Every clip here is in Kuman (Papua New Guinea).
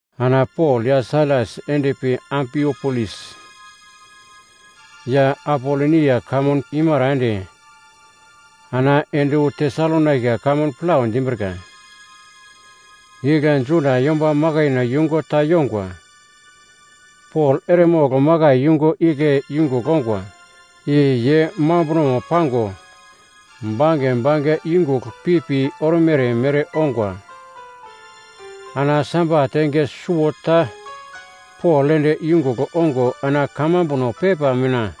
Ana Pol ya Sailas endpi Ampipolis ya Apolonia kamun imara ende ana ende wu Tesalonaika kamun plau dimbrika. Igle Juda yomba makaino yungu ta yongwa. Pol eremogl makai yungu igle yungugl ongwa, i ye mambunomo pango, bange bange yungugl pipi ormere mere ongwa. Ana Sabat enge suwota Pol ende yungugl ongo ana kamambuno pepa mina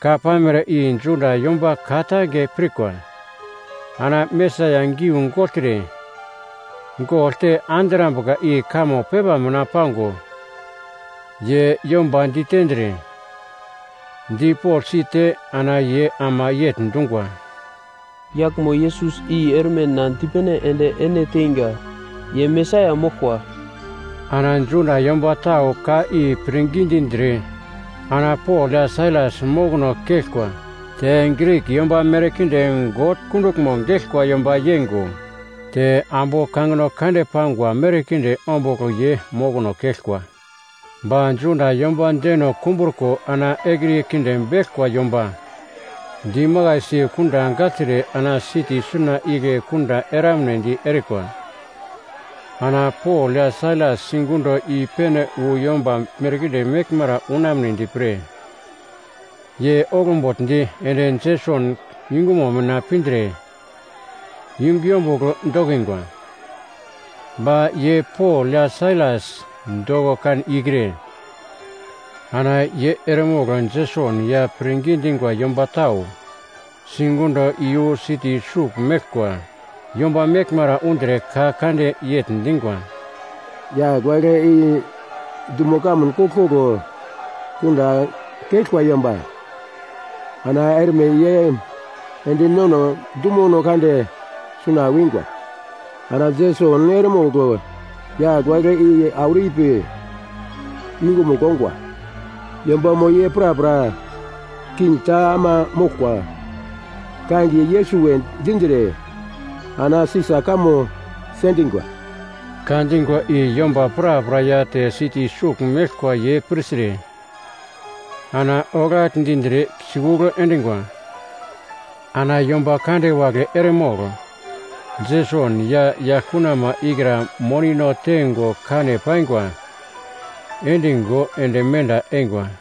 ka pamere i Juda yomba ka-tange pirkwa. Ana Mesaia giu gogltre, gogl te andrambuka i kamo pepa mina pango, ye yomba ditendre, dipogl site, ana ye ama yegl dungwa, “Yaglmo Yesus i erme na dipene ende ene teinga, ye Mesaia moglkwa.” Ana Juda yomba tau ka i pirngi dindre ana Pol ya Sailas mokono keglkwa, te Grik yomba merkinde God kunduglmo geglkwa yomba yeingo, te ambu kangino kande pangwa merkinde ombugl ye mokono keglkwa. Ba Juda yomba deno kumbruko ana ekriye kinde beglkwa yomba dimakaisi kunda gagltre ana siti suna igle kunda eramnedi erikwa. Ana Pol ya Sailas sigundo i-pene wu yomba merkinde meglmara unamnedi pre, ye oglbugldi ende Jeson yungumo mina pindre yungu yombugl dokingwa. Ba ye Pol ya Sailas doko kan ikre, ana ye eremogl Jeson ya pirngi dingwa yomba tau sigundo iyu siti sugl meglkwa yomba meglmara undre ka kande yegl dingwa, “Yagl wagle i dumo kamun koglkoglo kunda keglkwa yomba! Ana erme ye ende nono dumono kande suna wingo, ana Jeson eremogl yagl wagle i auro ipi yungumugl ongwa. Yombamo ye prapra king ta ama moglkwa, kangiye Yesus we dindre ana Sisa kamo sendingwa.” Ka dingwa i yomba prapra ya te siti sugl meglkwa ye pirtre ana oglagl dindre sikugl endingwa. Ana yomba kande wagle eremogl Jeson ya yaglkunama ikra monino teingo kane paingwa, endingo ende menda eingwa.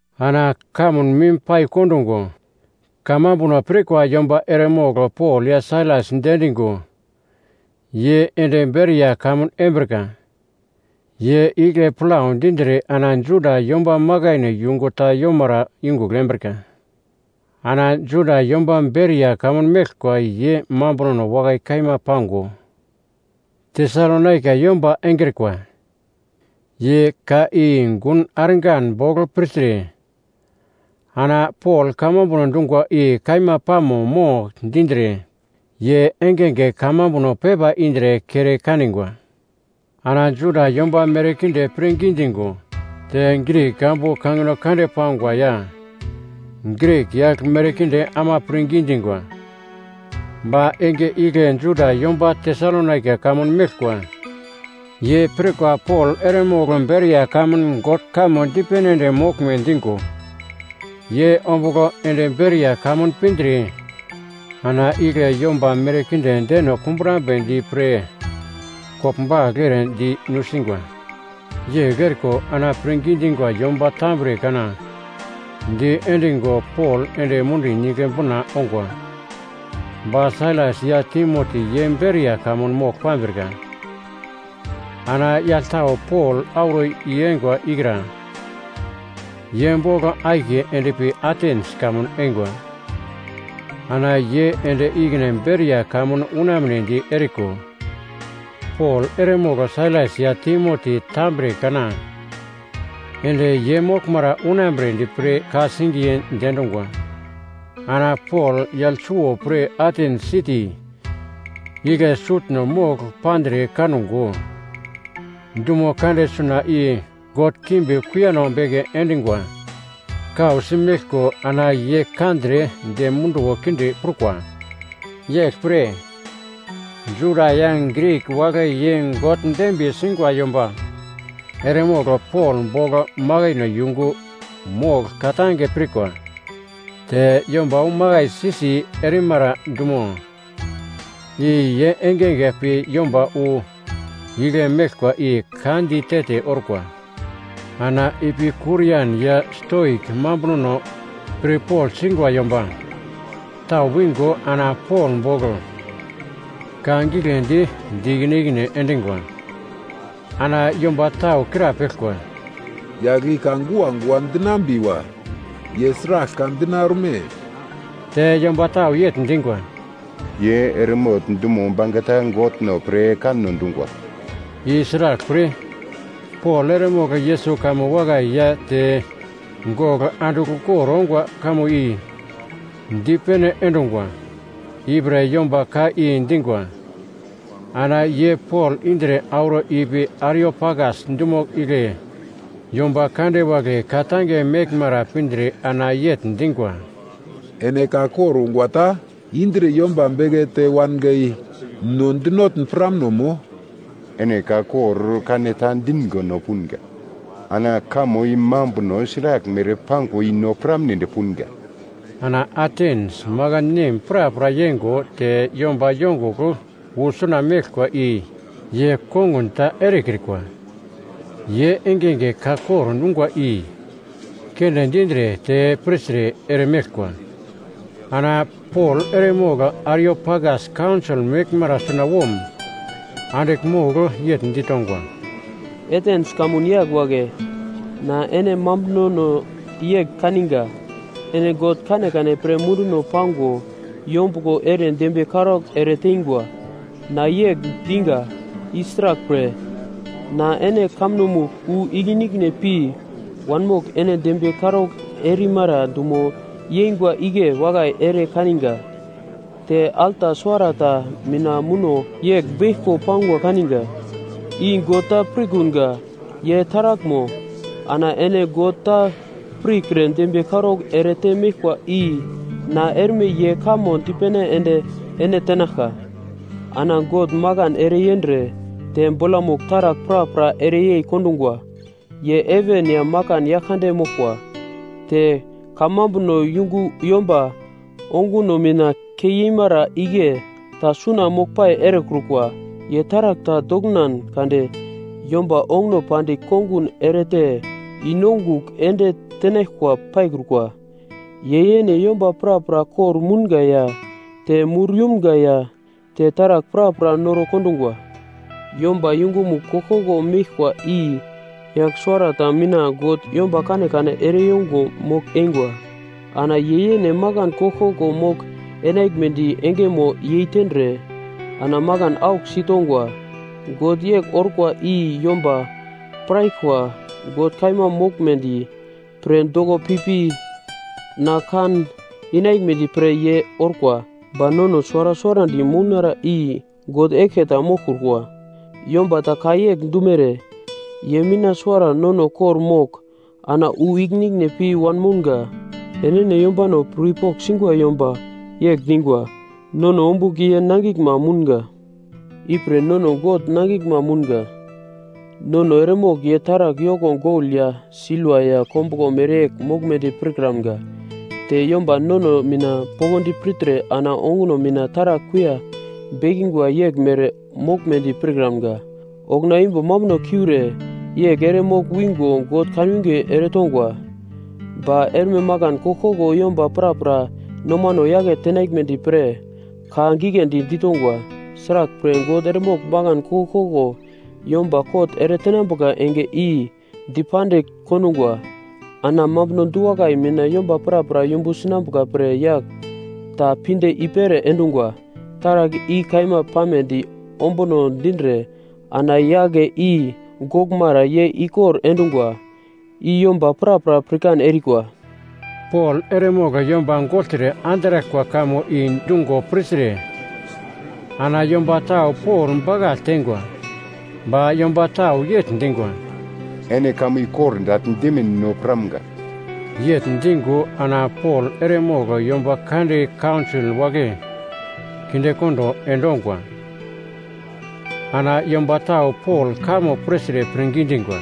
Ana kamun mim pai kondungo kamambuno pirkwa yomba eremogl Pol ya Sailas diendingo ye ende Beria kamun embrika. Ye igle plau dindre ana Juda yomba makaino yungu ta yomara yungugl embrika. Ana Juda yomba Beria kamun meglkwa ye mambunono wakai kaima pango, Tesalonaika yomba engrikwa. Ye ka i gun argan bogl pirtre, ana Pol kamambuno dungwa i kaima pamo mo dindre, ye engenge kamambuno pepa indre kere kanigwa. Ana Juda yomba merkinde pirngi dingo, te Grik ambu kangino kande pangwa ya Grik yagl merkinde ama pirngi dingwa. Ba enge igle Juda yomba Tesalonaika kamun meglkwa ye pirkwa Pol eremogl Beria kamun God kamo dipene ende moglme dingo, ye ombugl ende Beria kamun pindre ana igle yomba merkinde deno kumbrambedi pre koglbagl ere di nusingwa. Yegl eriko ana pirngi dingwa yomba tambre kana diendingo Pol ende mundi nigle bina ongwa. Ba Sailas ya Timoti ye Beria kamun mogl pambrika. Ana yagl tau Pol auro i-eingwa ikra, ye bogl akiye endpi Atens kamun eingwa, ana ye ende ikine Beria kamun unamnedi eriko, Pol eremogl Sailas ya Timoti tambre kana ende ye moglmara unambredi pre ka-singiye diendungwa. Ana Pol yagl suwo pre Atens siti igle sutno mogl pandre kango, dumo kande suna i god kimbi kuiyano beke endingwa kausi meglko ana ye kandre dem munduwo kinde prukwa. Yeglpre, Juda ya Grik wagle ye God dembiye singwa yomba eremogl Pol bogl makaino yungu mogl ka-tange pirkwa. Te yomba wu makaisi-si erimara dumo i ye engenge pi yomba wu igle meglkwa i ka di te-te orkwa. Ana Epikurian ya Stoik mambunono pirpogl singwa yomba tau wingo ana Pol bogl ka giglendi di ikine ikine endingwa. Ana yomba tau krapeglkwa, “Yagl i ka guagua dinambiwa ye sragl ka dina orme?” Te yomba tau yegl dingwa, “Ye eremogl dumo bangeta godno pre kanno dungwa.” I sraglpre, Pol eremogl Yesus kamo wakai ya te gogl andigl ukor ongwa kamo i dipene endungwa, ipre yomba ka i dingwa. Ana ye Pol indre auro ipi Ariopagas dumo igle yomba kande wagle ka-tange meglmara pindre ana yegl dingwa, “Ene ka kor ungwa ta indre yomba bekete wanga i no dinotn piramno mo? Ene ka kor kaneta dingo no punga, ana kamo i mambuno sraglmere pangwa i no piramnedi punga.” Ana Atens makan nem prapra yeingo te yomba yongugl wu suna meglkwa i ye kongun ta erekrikwa, ye engenge ka kor ungwa i keunde dindre te pirtre eremeglkwa. Ana Pol eremogl Ariopagas kaunsol meglmara sunawom andigl mogl yegl ditongwa, “Atens kamun yagl wagle, na ene mambunono yegl kaninga, ene god kanekane pre munduno pango yombuglo ere dembiye karaugl ereteingwa. Na yegl diga i sraglpre, na ene kamunomugl wu ikine-ikine pi wanmogl ene dembiye karaugl erimara dumo yeingwa igle wakai ere kaninga, te alta suwarata mina muno yegl beglko pangwa kaninga, ‘I GOD TA PIRKUNGA YE TARAGLMO.’ Ana ene God ta pirkre dembiye karaugl erete meglkwa i na erme ye kamo dipene ende ene tenaglka. “Ana God makan ereyendre, te bolamugl taragl prapra ereyei kondungwa. Ye heven ya makan Yaglkande moglkwa, te kamambuno yungu yomba onguno mina keimara igle ta suna moglpai erekrukwa. Ye taragl ta doknan kade yomba onguno pandigl kongun erete i-nongugl ende tenaglkwa paikrukwa. Ye yene yomba prapra kor-mounga ya te mur yumga ya te taragl prapra noro kondungwa. Yomba uglomugl koglkoglo meglkwa i yagl suwarata mina God yomba kanekane ereyongo mogl-eingwa. Ana ye yene makan koglkoglo mogl-enaglmedi engeno yeitendre, ana makan aglosi tongwa. God yegl orkwa i yomba piraglkwa God kaima moglmedi pre doko pipi na kan inaglmedi pre ye orkwa. Ba nono suwara suwarandi mounara i God eglke ta moglkrukwa. Yomba ta ka yegl dumere, ‘Ye mina suwara nono kor-mogl ana wu ikine ikine pi wanmounga.’ Enene yombano pirpogl singwa yomba yegl dingwa, ‘Nono ombugl ye nangiglma mounga.’ “Ipre nono God nangiglma mounga. Nono eremogl ye taragl yoko gol ya silva ya kombuglo mereyegl moglmedi pirkramga, te yomba nomano mina poglodi pirtre ana onguno mina taragl kuiya bekingwa yeglmere moglmedi pirkramga. Okuna imbo mambuno kiure yegl ere mogl-wingo God kanwinge eretongwa, ba erme makan koglkoglo yomba prapra nomano yake tenaglmedi pre ka giglendi ditongwa. Sraglpre, God eremogl makan koglkoglo yomba kot eretenambuka enge i dipandigl kondungwa. Ana mambuno du-wakai mina yomba prapra yumbu sinambuka pre yagl ta pinde i-pere endungwa. Taragl i kaima pamedi ombuno dindre ana yagle i goglmara ye ere-ikor endungwa, i yomba prapra pirkan erikwa!” Pol eremogl yomba gogltre andraglkwa kamo i dungo pirtre, ana yomba tau Pol bakagl teingwa ba yomba tau yegl dingwa, “Ene kamo i kordagl dimin no piramga.” Yegl dingo ana Pol eremogl yomba kande kaunsol wagle kindekondo endongwa. Ana yomba tau Pol kamo pirtre pirngi dingwa.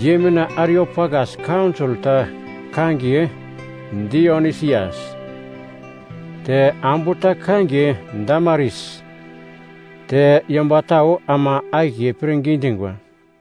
Ye mina Ariopagas kaunsol ta kangiye Dionisias, te ambu ta kangiye Damaris, te yomba tau ama akiye pirngi dingwa.